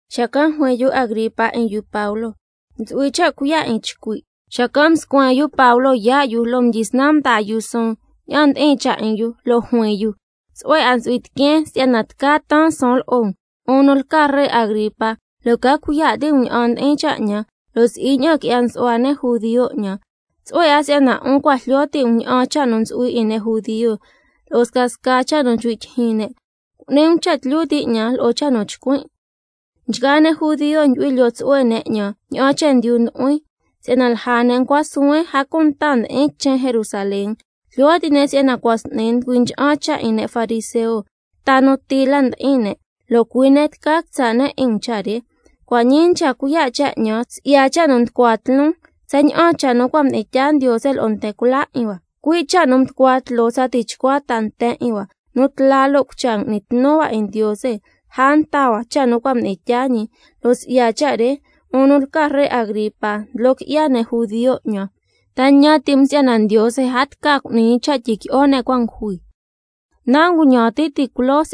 Xacan' juin yu Agripa 'in yu Pablo: Ntsu'hui cha' cuiya' 'in chcui'. Xacan' mscuen yu Pablo yaa' yu, lo' mdyisnan mdaa yu suun ña'an ndi'in cha' 'in yu, lo' juin yu: Tsu'hue 'a ntsu'hui tiqueen si'yana tca taan suun lo'o um, 'un nu lca ree Agripa, lo' ca cuiya' ti' um ña'an ndi'in cha' 'ñan, lo' si'i ña'an qui'ya nsu'hua ne' judio 'ñan. Tsu'hue 'a si'yana 'un cua' jlyo ti' um ña'an cha' nu ntsu'hui 'in ne' judio lo'o scasca cha' nu nchcui' tyijyin ne'. Cu'ni um cha' tlyu ti' 'ñan lo'o cha' nu chcuin'. Nchgaa ne' judio ndyu'hui lyoo tsu'hue ne' 'ñan ña'an chendyu nu mdu'huin, si'yana lja ne' ncua suhuen, a cunta mdi'in quichen Jerusalén. Jlyo ti' ne' si'yana cua' s'ni nducui ncha'an cha' 'in ne' fariseo, ta nu ti lati ndi'in ne', lo' cui' ne' tca quitsa' ne' 'in um cha' re. Cua' ñii nchca cuiya' cha' 'ñan si'ya cha' nu nducua tloon, tsaña'an cha' nu cua' mdi'in tyaa Ndiose lo'o nten cula 'in hua, cui' cha' nu nducua tloo tsa tichcua ta nten 'in hua, nu tla lo' cucha ngui'ni tnu hua 'in Ndiose lja nta hua cha' nu cua' mdi'in tyaa ñi, lo' si'ya cha' re, 'un nu lca ree Agripa, ndlo qui'ya ne' judio 'ñan. ¿Ta ñan ti' um si'yana Ndiose a tca cu'ni ñi cha' tyiqui'o ne' cua' ngujui? Ña'an mxitijin yu Pablo nu ti'i 'in jun ti' culoo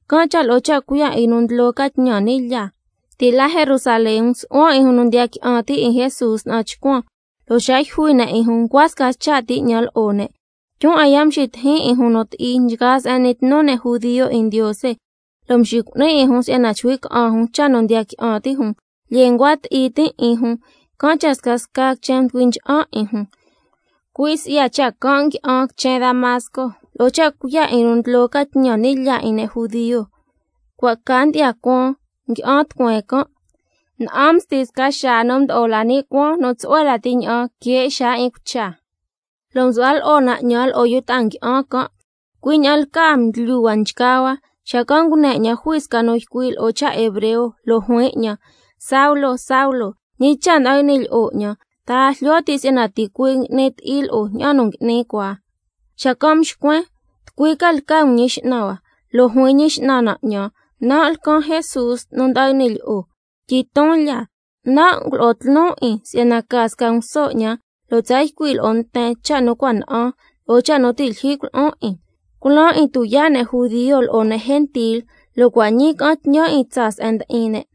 can' cha' lo'o cha' cuiya' 'in yu nu ndlo ca tñan ni' lyaa, ti' la quichen Jerusalén msu'huan 'in jun nu ndiya qui'an ti' 'in Jesús na'an chcuan, lo' xa yjui ne' 'in jun ncua sca cha' ti 'ñan lo'o ne'. Tyun 'a ya' mxitijin 'in jun nu ti'i nchgaa se'en n'ni tnu ne' judio 'in Ndiose, lo' mxicu'nin 'in jun si'yana chcui' ca'an jun cha' nu ndiya qui'an ti' jun. Lyee ncua ti'i tin' 'in jun, can' cha' scasca quichen mducui ncha'an 'in jun. Cui' si'ya cha' can' ngui'an quichen Damasco lo'o cha' cuiya' 'in yu nu ndlo ca tñan ni' lyaa 'in ne' judio. Cua' ca ndyi'ya cuaan ngui'an tucueen can', na'an msti sca xaa nu mdo'o la ni' cuaan nu tsu'hue lati ña'an que xaa 'in cucha, lo' msu'hua lo'o na 'ñan lo'o yu ta'a ngui'an can'. Cui' ña'an lcaa mdlyu hua nchgaa hua, xacan' ngune 'ñan jui sca nu ycui' lo'o cha' hebreo, lo' juin 'ñan: Saulo, Saulo, ¿ñi cha' nda'an y'ni lyi'o 'ñan? ¿Ta a jlyo ti' si'yana ticuii' ngui'ni ti'i lo'o ña'an nu ngui'ni cua? Xacan' mxcuen: ¿Tucui ca lca um Ñi X'nan hua? Lo' juin Ñi X'nan na 'ñan: Nan' lcan Jesús nu nda'an y'ni lyi'o. Tyiton lya, nan' ngulo'on tloon 'in si'yana ca sca nguso 'ñan, lo' tsa ycui' lo'o nten cha' nu na'an cua' ñii, lo'o cha' nu ti' lyijyi culo'on 'in. Culaan 'in tuyaa' ne' judio lo'o ne' gentil, si'yana cua' ñii ca'an tñan 'in tsaa se'en ndi'in ne',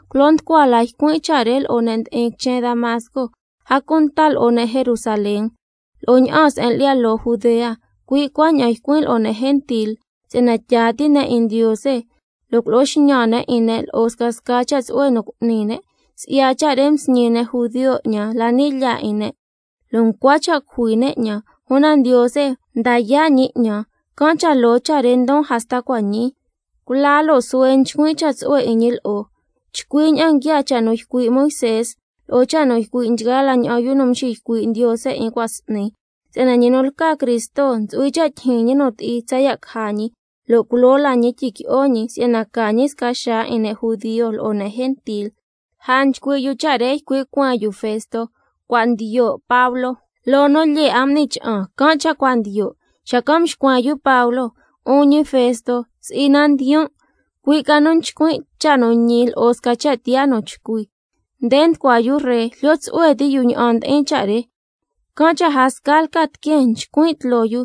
Culo nducua la ycuin' cha' re lo'o ne' ndi'in quichen Damasco, a cunta lo'o ne' Jerusalén, lo'o ña'aan se'en lyi'ya loo Judea, cui' cuaña'an ycuin' lo'o ne' gentil si'yana tyaa ti' ne' 'in Ndiose, lo' culo'o xñan ne' 'in ne' lo'o scasca cha' tsu'hue nu cu'ni ne'. Si'ya cha' re msñi ne' judio 'ñan la ni' lyaa 'in ne', lo' ncua cha' cujui ne' 'ñan. Una Ndiose mda yaa' ñi 'ñan, can' cha' loo cha' re ndon hasta cua' ñii, cula lo' suhue nchcuin' cha' tsu'hue 'in ñi lo'o, chcui ña'an nguiaa cha' nu ycui' Moisé lo'o cha' nu ycui' nchgaa la ña'an yu nu mxiycui' Ndiose 'in cua' s'ni: si'yana ñi nu lca Cristo ntsu'hui cha' tyijyin ñi nu ti'i tsaya' caja ñi, lo' culoo la ñi tyiqui'o ñi si'yana ca ñi sca xaa 'in ne' judio lo'o ne' gentil. Lja nchcui' yu cha' re, ycui' cueen yu Festo: Cua' ndiyo' Pablo, loo nu lyee 'a m'ni cha'an can' cha' nchca ndiyo'. Xacan' mxcuen yu Pablo: 'Un ñi Festo, si'i na ndiyon', cui' ca nu nchcuin' cha' nu ñi lo'o sca cha' tiyaa nu chcui. Nde nducua yu ree, jlyo tsu'hue ti' yu ña'an ndi'in cha' re, can' cha' a sca lca tiqueen chcuin' tloo yu,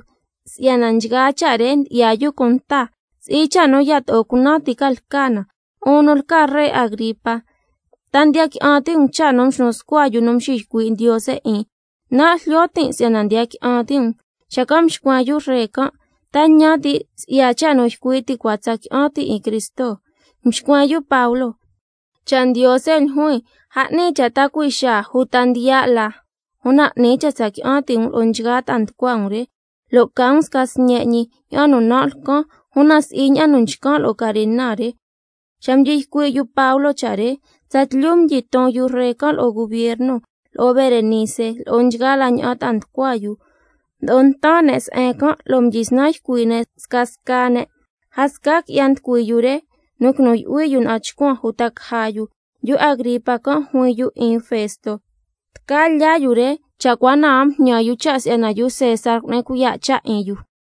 si'yana nchgaa cha' re ndyi'ya yu cunta si'yana si'i cha' nu yato'o cunan ti ca lca na. 'Un nu lca ree Agripa, ¿ta ndiya qui'an ti' um cha' nu mxnu scua yu nu mxiycui' Ndiose 'in? Nan' jlyo tin' si'yana ndiya qui'an ti' um. Xacan' mxcuen yu ree can': ¿Ta ñan ti' si'yana lo'o cha' nu ycui' ti cua, tsa qui'an tin' 'in Cristo? Mxcuen yu Pablo: Cha' Ndiose ljuin, a 'ni cha' ta cui' xaa uta ndiya' la, una 'ni cha' tsa qui'an ti' um lo'o nchgaa ta'a nducua um re, lo' ca um sca sñe' ñi ña'an nu lcan, una si'i ña'an nu nchcan' lo'o carena re. Xa mdyi ycui' yu Pablo cha' re, tsatlyu mdyiton yu ree can', lo'o gubierno, lo'o Berenice, lo'o nchgaa la ña'an ta'a nducua yu. Mdo'o ntan ne' se'en can', mdyisnan ycui' ne' scasca ne', lo' nchcui' ne': A sca qui'ya nducui yu re nu quinu yu'hui yu na'an chcuan uta caja yu. Yu Agripa can' juin yu 'in Festo: Tca lyaa yu re cha' cua na a mjñan yu cha' si'yana yu César cu'ni cuiya' cha' 'in yu.